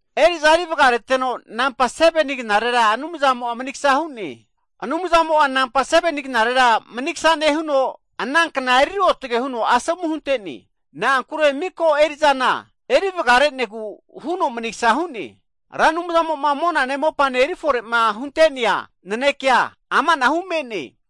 Eri'za eri vgareteno, 7ni knarera Anumzamo manigsa hu'ne. Anumzamo 7ni knarera manigsa nehuno, ana kna eri ruotge huno asomu hunte'ne. Na'ankure miko'a eri'za eriva reteno manigsa hu'ne. Ra Anumzamo monane mopane erifore hunte'nea nanekea, amanahu me'ne.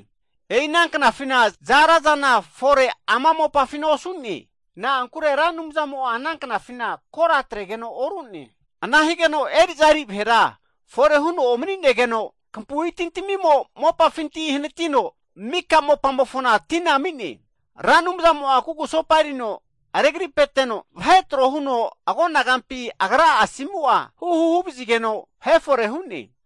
E'i ana knafi za'ara zana fore osu'ne, na'ankure Ra Anumzamo ana knafina kora huntegeno oru'ne. Eri'za eri vahera fore huno omni'negeno, kampui timo mopafinti hanatino mika mopamofona tina ami'ne. Ra Anumzamo kugusopa erino regripeno vahe tro huno agonagampi Agra'a asimu'a huhu huvazigeno, vahe fore hu'ne.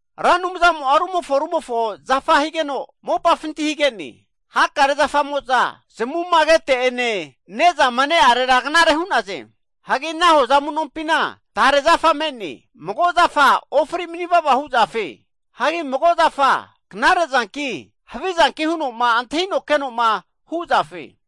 Ra Anumzamo rumofo rumofo zafa higeno, mopafinti hage'ne. Hakare zafamo'a zamuma kete'ene ne'zanena knare hu'ne. Hagi ana hoza amu'nompi tare zafa me'ne. Mago zafa ofri manivava hu zafe. Hagi magora tamazane havizane antahi zafe.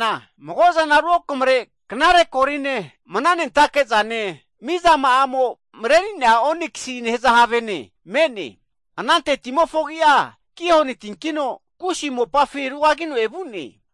Ana mopafina knare koline, mna nentake'zane konaririane mizama'amo mreri'nea oniksie nehaza have me'ne. Anante timofo agi'a Gihon tine. Kusi mopafi rugagino evu'nea tine.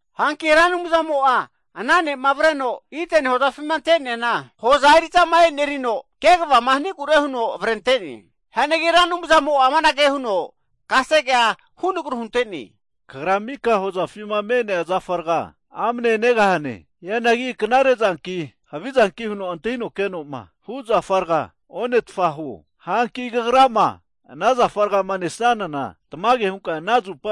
Hanki Ra Anumzamo ana nera avreno Ideni hozafima ante'neana, hoza eri'zama enerino kvama hanigure huno avrente'ne. Ra Anumzamo kasege hunteno, kagra mika hozafima me'nea zafa rga amne negahananagi, knare'zanki havi'zanki huno antahi zafa rga ono. Hanki kagrama nesnanana tmage hunka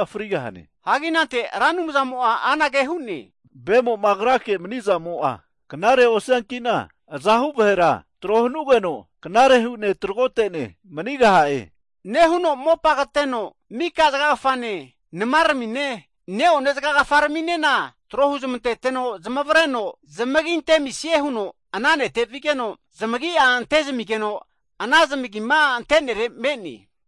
frigahane. Ra Anumzamo anage hu'ne, vemo agrake maniazamo'a knare osianki'na, azahu vahera tro hanugeno knare hu'ne tragotene manigaha'e. Mopa kateno mika zgagfane, nmane ne'one zgagfazga tro huzmanteno zmareno zamagi antezmisie huno ana nete zamareno vigeno, zamagi'a ante'zmigeno ana zamagima ante'nere me'ne.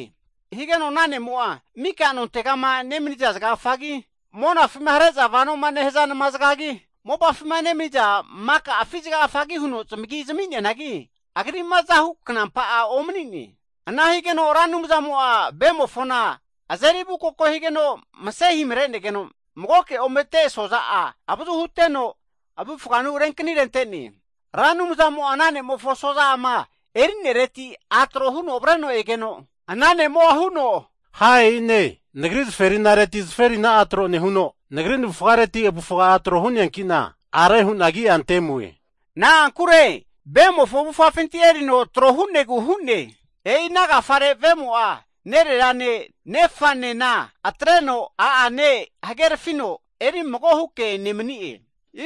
Higeno ana ne'mo mika'ma nontega mni zgagfagi, monafima hareno vonoma nehia nma'zgagi, mopafima maka afi zgagfagi huno zamagi zmi'neanagi, mago agri azahu knampa'a omni'ne. Ana higeno Ra Anumzamo ve mofona azeri avukoko higeno mse himre'negeno, magoke omete asoza'a avazu huteno, avufanu renknirente'ne. Ra Anumzamo ana ne'mofo asozareti a' trohuno avreno egeno, ana ne'mo huno, ha e'ine! Nagri zferinane navufareti tro hu'ne, hanki'na are hu'na agi antemue, na'ankure e'i ve'mofo avufafinti erino trohu'ne. E'i ana agafare vemo'a nererane nefane atreno, a'ane hagerafino eri mago huke nemni'e.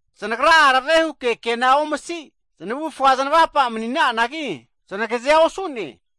Znagra arave huke kena omsi znavufga znavapa manina'anagi, znagazea osu'ne.